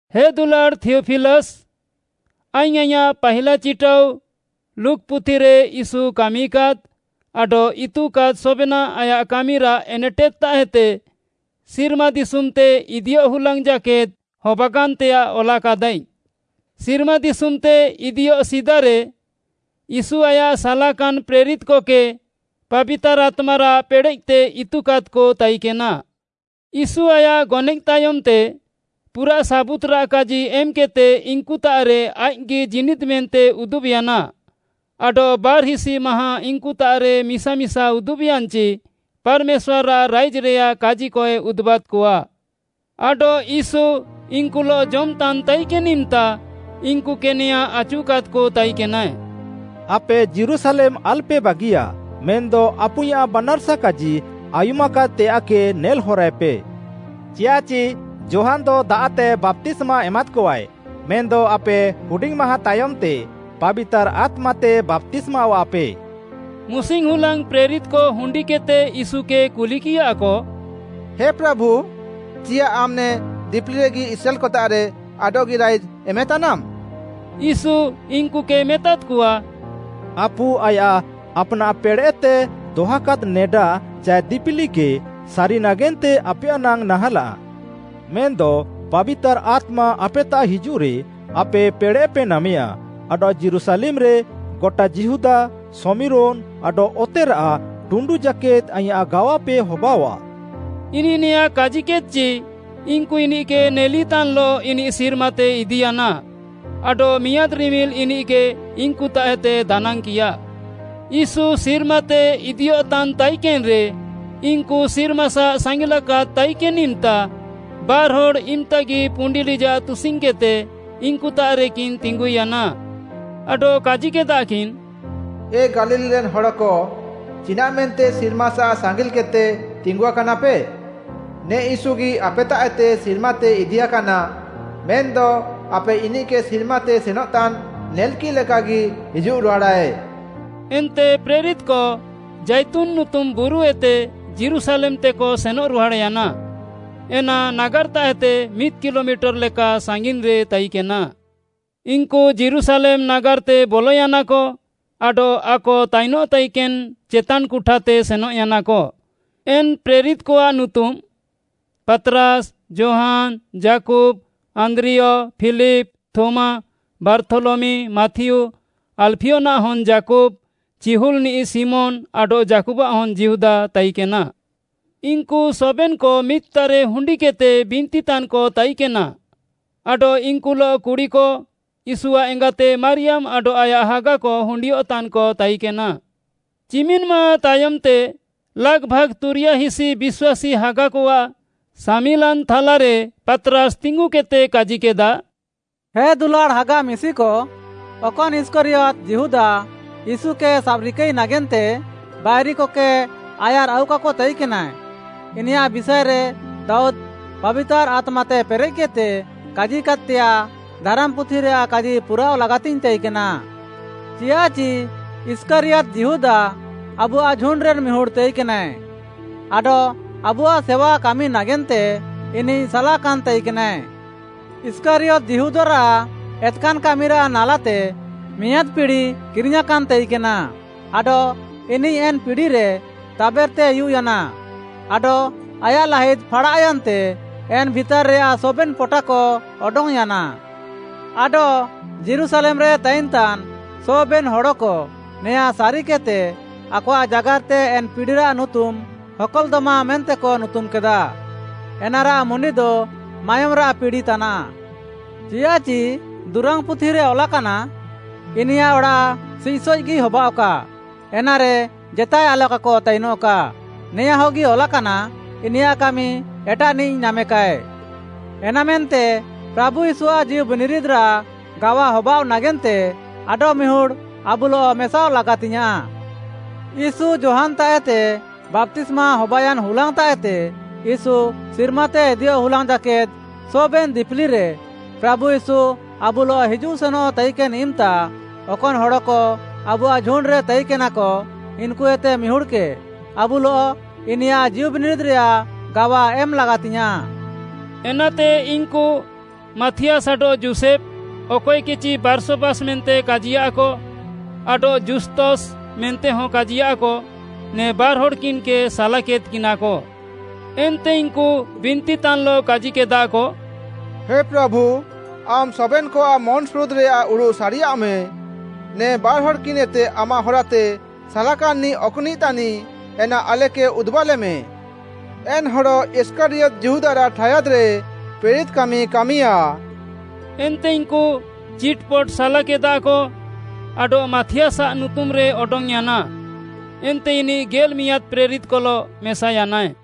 ହେ ଦୁଲାଡ଼୍‌ ଥିୟଫିଲସ୍‌, ଆଇଙ୍ଗ୍‌ ଆଇଁୟାଃ ପାହିଲା ଚିଟାଉ ଲୁକ୍‌ ପୁଥିରେ ୟୀଶୁ କାମିକାଦ୍‌ ଆଡଃ ଇତୁକାଦ୍‌ ସବେନାଃ ଆୟାଃ କାମିରାଃ ଏନେଟେଦ୍‌ତାଃଏତେ ସିର୍ମାଦିଶୁମ୍‌ତେ ଇଦିୟଃ ହୁଲାଙ୍ଗ୍‌ ଜାକେଦ୍‌ ହବାକାନ୍‌ତେୟାଃ ଅଲାକାଦାଇଙ୍ଗ୍‌। ସିର୍ମାଦିଶୁମ୍‌ତେ ଇଦିୟଃ ସିଦାରେ ୟୀଶୁ ଆୟାଃ ସାଲାକାନ୍‌ ପ୍ରେରିତ୍‌କକେ ପାବିତାର୍‌ ଆତ୍ମାରାଃ ପେଡ଼େଃତେ ଇତୁକାଦ୍‌କ ତାଇକେନା। ୟୀଶୁ ଆୟାଃ ଗନଏଃ ତାୟମ୍‌ତେ ପୁରାଃ ସାବୁତ୍‌ରାଃ କାଜି ଏମ୍‌କେଦ୍‌ତେ ଇନ୍‌କୁତାଃରେ ଆଇଃକ୍‌ଗି ଜୀନିଦ୍‌ ମେନ୍ତେ ଉଦୁବ୍‌ୟାନା, ଆଡଃ ବାର୍‌ହିସି ମାହାଁ ଇନ୍‍କୁତାଃରେ ମିସା ମିସା ଉଦୁବ୍‌ୟାନ୍‌ଚି ପାର୍‌ମେଶ୍ୱାର୍‌ଆଃ ରାଇଜ୍‌ରେୟାଃ କାଜିକଏ ଉଦୁବାଦ୍‌କଆ। ଆଡଃ ୟୀଶୁ ଇନ୍‌କୁଲଃ ଜମ୍‌ତାନ୍‌ ତାଇକେନ୍‌ ଇମ୍‌ତା, ଇନ୍‌କୁକେ ନେଆଁଁ ଆଚୁକାଦ୍‌କ ତାଇକେନାଏ, ଆପେ ଯୀରୁଶାଲେମ୍‌ ଆଲ୍‌ପେ ବାଗିୟା, ମେନ୍‌ଦ ଆପୁଇଁୟାଃ ବାନାର୍‌ସା କାଜି ଆୟୁମାକାଦ୍‌ତେୟାଃକେ ନେଲ୍‌ହରାଏପେ। ଚିୟାଃଚି ଯୋହାନ୍‌ଦ ଦାଆଃତେ ବାପ୍ତିସ୍ମା ଏମାଦ୍‌କଆଏ, ମେନ୍‌ଦ ଆପେ ହୁଡିଙ୍ଗ୍‌ ମାହାଁ ତାୟମ୍‌ତେ ପାବିତାର୍‌ ଆତ୍ମାତେ ବାପ୍ତିସ୍ମାୱାଃପେ। ମୁସିଙ୍ଗ୍‌ ହୁଲାଙ୍ଗ୍‌ ପ୍ରେରିତ୍‌କ ହୁଣ୍ଡିକେଦ୍‌ତେ ୟୀଶୁକେ କୁଲିକିୟାକ, “ହେ ପ୍ରାଭୁ, ଚିୟାଃ ଆମ୍‌ ନେ ଦିପିଲିରେଗି ଇସ୍ରାଏଲ୍‌କତାଃରେ ଆଡଃଗି ରାଇଜ୍‌ ଏମେତାନାମ୍‌?” ୟୀଶୁ ଇନ୍‌କୁକେ ମେତାଦ୍‌କଆ, “ଆପୁ ଆୟାଃ ଆପ୍‌ନାଃ ପେଡ଼େଃତେ ଦହାକାଦ୍‌ ନେଡା ଚାଏ ଦିପିଲିକେ ସାରି ନାଗେନ୍ତେ ଆପେୟାଃ ନାଙ୍ଗ୍‌ ନାହାଁଲାଃ। ମେନ୍‌ଦ ପାବିତାର୍‌ ଆତ୍ମା ଆପେତାଃ ହିଜୁଃରେ, ଆପେ ପେଡ଼େଃପେ ନାମେୟା ଆଡଃ ଯୀରୁଶାଲେମ୍‌ରେ, ଗଟା ଯିହୁଦା, ଶମିରୋନ୍‌ ଆଡଃ ଅତେରାଃ ଟୁଣ୍ଡୁ ଜାକେଦ୍‌ ଆଇଁୟାଃ ଗାୱାପେ ହବାଅଆଃ।” ଇନିଃ ନେଆଁଁ କାଜିକେଦ୍‌ଚି, ଇନ୍‌କୁ ଇନିଃକେ ନେଲିତାନ୍‍ଲଃ ଇନିଃ ସିର୍ମାତେ ଇଦିୟାନା, ଆଡଃ ମିଆଁଦ୍‌ ରିମିଲ୍‌ ଇନିଃକେ ଇନ୍‍କୁତାଃଏତେ ଦାନାଙ୍ଗ୍‌କିୟା। ୟୀଶୁ ସିର୍ମାତେ ଇଦିୟଃତାନ୍‌ ତାଇକେନ୍‌ରେ ଇନ୍‌କୁ ସିର୍ମାସାଃ ସାଙ୍ଗିଲାକାଦ୍ ତାଇକେନ୍‌ ଇମ୍‌ତା, ବାର୍‌ହଡ଼୍‌ ଇମ୍‌ତାଗି ପୁଣ୍ଡି ଲିଜାଃ ତୁସିଙ୍ଗ୍‌କେଦ୍‌ତେ ଇନ୍‍କୁତାଃରେକିନ୍ ତିଙ୍ଗୁୟାନା। ଆଡଃ କାଜିକେଦାକିନ୍‌, “ଏ ଗାଲିଲ୍‌ରେନ୍ ହଡ଼କ, ଚିନାଃମେନ୍ତେ ସିର୍ମାସାଃ ସାଙ୍ଗିଲ୍‌କେଦ୍‌ତେ ତିଙ୍ଗୁଆକାନାପେ? ନେ ୟୀଶୁଗି ଆପେତାଃଏତେ ସିର୍ମାତେ ଇଦିୟାକାନା। ମେନ୍‌ଦ ଆପେ ଇନିଃକେ ସିର୍ମାତେ ସେନଃତାନ୍‌ ନେଲ୍‌କିଃ ଲେକାଗି ହିଜୁଃରୁହାଡ଼ାଏ।” ଏନ୍ତେ ପ୍ରେରିତ୍‌କ ଜାଇତୁନ୍‌ ନୁତୁମ ବୁରୁଏତେ ଯୀରୁଶାଲେମ୍‌ତେକ ସେନଃରୁହାଡ଼୍‌ୟାନା, ଏନା ନାଗାର୍‌ତାଃଏତେ ମିଦ୍‌ କିଲୋମିଟର୍‌ ଲେକା ସାଙ୍ଗିନ୍‌ରେ ତାଇକେନା। ଇନ୍‌କୁ ଯୀରୁଶାଲେମ୍‌ ନାଗାର୍‌ତେ ବଲୟାନାକ ଆଡଃ ଆକ ତାଇନଃ ତାଇକେନ୍‌ ଚେତାନ୍‌ କୁଠାତେ ସେନଃୟାନାକ। ଏନ୍‌ ପ୍ରେରିତ୍‌କଆଃ ନୁତୁମ୍‌ ପାତ୍‌ରାସ୍‌, ଯୋହାନ୍‌, ଯାକୁବ୍‌, ଆନ୍ଦ୍ରିୟ, ଫିଲିପ୍‌, ଥୋମା, ବାର୍ଥୋଲମି, ମାଥିଉ, ଆଲ୍‌ଫିୟନାଃ ହନ୍‌ ଯାକୁବ୍‌, ଚିହୁଲ୍‌ନିଃ ଶିମୋନ୍‌ ଆଡଃ ଯାକୁବ୍‌ଆଃ ହନ୍‌ ଯିହୁଦା ତାଇକେନା। ଇନ୍‌କୁ ସବେନ୍‌କ ମିଦ୍‌ତାଃରେ ହୁଣ୍ଡିକେଦ୍‌ତେ ବିନ୍ତିତାନ୍‌କ ତାଇକେନା ଆଡଃ ଇନ୍‌କୁଲଃ କୁଡ଼ିକ, ୟୀଶୁଆଃ ଏଙ୍ଗାତେ ମାରିୟାମ୍‌ ଆଡଃ ଆୟାଃ ହାଗାକ ହୁଣ୍ଡିୟଃତାନ୍‌କ ତାଇକେନା। ଚିମିନ୍‌ ମାହାଁଁ ତାୟମ୍‌ତେ ଲାଗ୍‌ଭାଗ୍‌ ତୁରିୟାହିସି ବିଶ୍ୱାସୀ ହାଗାକଆଃ ସାମିଲାନ୍‌ ଥାଲାରେ ପାତ୍‌ରାସ୍‌ ତିଙ୍ଗୁକେଦ୍‌ତେ କାଜିକେଦା, “ହେ ଦୁଲାଡ଼୍‌ ହାଗା ମିଶିକ, ଅକନ୍‌ ଇଷ୍କାରିୟତ୍‌ ଯିହୁଦା ୟୀଶୁକେ ସାବ୍‌ରିକାଇ ନାଗେନ୍ତେ ବାଇରିକକେ ଆୟାର୍‌ଆଉକାକ ତାଇକେନା, ଇନିୟାଃ ବିଷାଏରେ ଦାଉଦ୍‌ ପାବିତାର୍‌ ଆତ୍ମାତେ ପେରେଃକେଦ୍‌ତେ କାଜିକାଦ୍‌ତେୟାଃ, ଧାରାମ୍‌ପୁଥିରେୟାଃ କାଜି ପୁରାଅଃ ଲାଗାତିଙ୍ଗ୍‌ ତାଇକେନା। ଚିଆଃଚି ଇଷ୍କାରିୟତ୍‌ ଯିହୁଦା ଆବୁଆଃ ଝୁଣ୍ଡ୍‌ରେନ୍‌ ମିହୁଡ଼୍‌ ତାଇକେନାଏ ଆଡଃ ଆବୁଆଃ ସେୱାକାମି ନାଗେନ୍ତେ ଇନିଃ ସାଲାକାନ୍‌ ତାଇକେନାଏ।” ଇଷ୍କାରିୟତ୍‌ ଯିହୁଦାରାଃ ଏତ୍‌କାନ୍‌ କାମିରାଃ ନାଲାତେ ମିଆଁଦ୍‌ ପିଡ଼ି କିରିଙ୍ଗ୍‌ୟାଁକାନ୍‌ ତାଇକେନା ଆଡଃ ଇନିଃ ଏନ୍‌ ପିଡ଼ିରେ ତାବେର୍‌ତେ ଉୟୁଃୟାନା ଆଡଃ ଆୟାଃ ଲାହିଦ୍‌ ଫାଡ଼ାଃୟାନ୍‌ତେ ଏନ୍‌ ଭିତାର୍‌ରେୟାଃ ସବେନ୍‌ ପଟାକ ଅଡଙ୍ଗ୍‌ୟାନା। ଆଡଃ ଯୀରୁଶାଲେମ୍‌ରେ ତାଇନ୍‌ତାନ୍ ସବେନ୍‌ ହଡ଼କ ନେଆଁଁ ସାରିକେଦ୍‌ତେ, ଆକଆଃ ଜାଗାର୍‌ତେ ଏନ୍‌ ପିଡ଼ିରାଃ ନୁତୁମ୍‌ ହକଲ୍‌ଦମା ମେନ୍ତେକ ନୁତୁମ୍‌କେଦା, ଏନାରାଃ ମୁଣ୍ଡିଦ “ମାୟୋମ୍‌ରାଃ ପିଡ଼ି” ତାନାଃ। ଚିୟାଃଚି ଦୁରାଙ୍ଗ୍‌ପୁଥିରେ ଅଲାକାନା, ଇନିୟାଃ ଅଡ଼ାଃ ସିଃସଏଃଗି ହବାଅଃକା; ଏନାରେ ଜେତାଏ ଆଲକାକ ତାଇନଃକା। ନେଆଁଁହଗି ଅଲାକାନା, ଇନିୟାଃ କାମି ଏଟାଃନିଃ ନାମେକାଏ। “ଏନାମେନ୍ତେ ପ୍ରାଭୁ ୟୀଶୁଆଃ ଜୀଉବିନିରିଦ୍‌ରାଃ ଗାୱା ହବାଅଃ ନାଗେନ୍ତେ ଆଡଃମିହୁଡ଼୍‌ ଆବୁଲଃ ମେସାଅଃ ଲାଗାତିଙ୍ଗ୍‌ୟାଁଃ। ୟୀଶୁ ଯୋହାନ୍‌ତାଃଏତେ ବାପ୍ତିସ୍ମା ହବାୟାନ୍‌ ହୁଲାଙ୍ଗ୍‌ତାଃଏତେ ୟୀଶୁ ସିର୍ମାତେ ଇଦିୟଃ ହୁଲାଙ୍ଗ୍‌ ଜାକେଦ୍‌ ସବେନ୍‌ ଦିପିଲିରେ ପ୍ରାଭୁ ୟୀଶୁ ଆବୁଲଃ ହିଜୁଃ ସେନଃ ତାଇକେନ୍‌ ଇମ୍‌ତା, ଅକନ୍‌ ହଡ଼କ ଆବୁଆଃ ଝୁଣ୍ଡ୍‌ରେ ତାଇକେନାକ, ଇନ୍‌କୁଏତେ ମିହୁଡ଼୍‌କେ ଆବୁଲଃ ଇନିୟାଃ ଜୀଉବିନିରିଦ୍‌ରେୟାଃ ଗାୱା ଏମ୍‌ ଲାଗାତିଙ୍ଗ୍‌ୟାଁଃ।” ଏନାତେ ଇନ୍‌କୁ ମାଥିଆସ୍‌ ଆଡଃ ଯୋଷେଫ୍‌, ଅକଏକେଚି ବାର୍ଶବାସ୍‌ ମେନ୍ତେ କାଜିୟାଃକ ଆଡଃ ଜୁସ୍ତସ୍‌ ମେନ୍ତେହଁ କାଜିୟାଃକ, ନେ ବାର୍‌ହଡ଼୍‌କିନ୍‌କେ ସାଲାକେଦ୍‌କିନାକ। ଏନ୍ତେ ଇନ୍‌କୁ ବିନ୍ତିତାନ୍‍ଲଃ କାଜିକେଦାକ, “ହେ ପ୍ରାଭୁ, ଆମ୍‌ ସବେନ୍‌କଆଃ ମନ୍‌ସୁରୁଦ୍‌ରେୟାଃ ଉଡ଼ୁଃ ସାରିୟାଃମେ। ନେ ବାର୍‌ହଡ଼୍‌କିନ୍‌ଏତେ ଆମାଃ ହରାତେ ସାଲାକାନ୍‌ନିଃ ଅକ୍‌ନିଃ ତାନିଃ ଏନା ଆଲେକେ ଉଦୁବାଲେମେ। ଏନ୍‌ ହଡ଼ ଇଷ୍କାରିୟତ୍‌ ଯିହୁଦାରାଃ ଠାୟାଦ୍‌ରେ ପ୍ରେରିତ୍‌ କାମି କାମିୟା।” ଏନ୍ତେ ଇନ୍‌କୁ ଚିଟ୍‌ପଟ୍‌ ସାଲାକେଦାକ ଆଡଃ ମାଥିଆସ୍‌ଆଃ ନୁତୁମ୍‌ରେ ଅଡଙ୍ଗ୍‌ୟାନା। ଏନ୍ତେ ଇନିଃ ଗେଲ୍‌ମିଆଁଦ୍‌ ପ୍ରେରିତ୍‌କଲଃ ମେସାୟାନାଏ।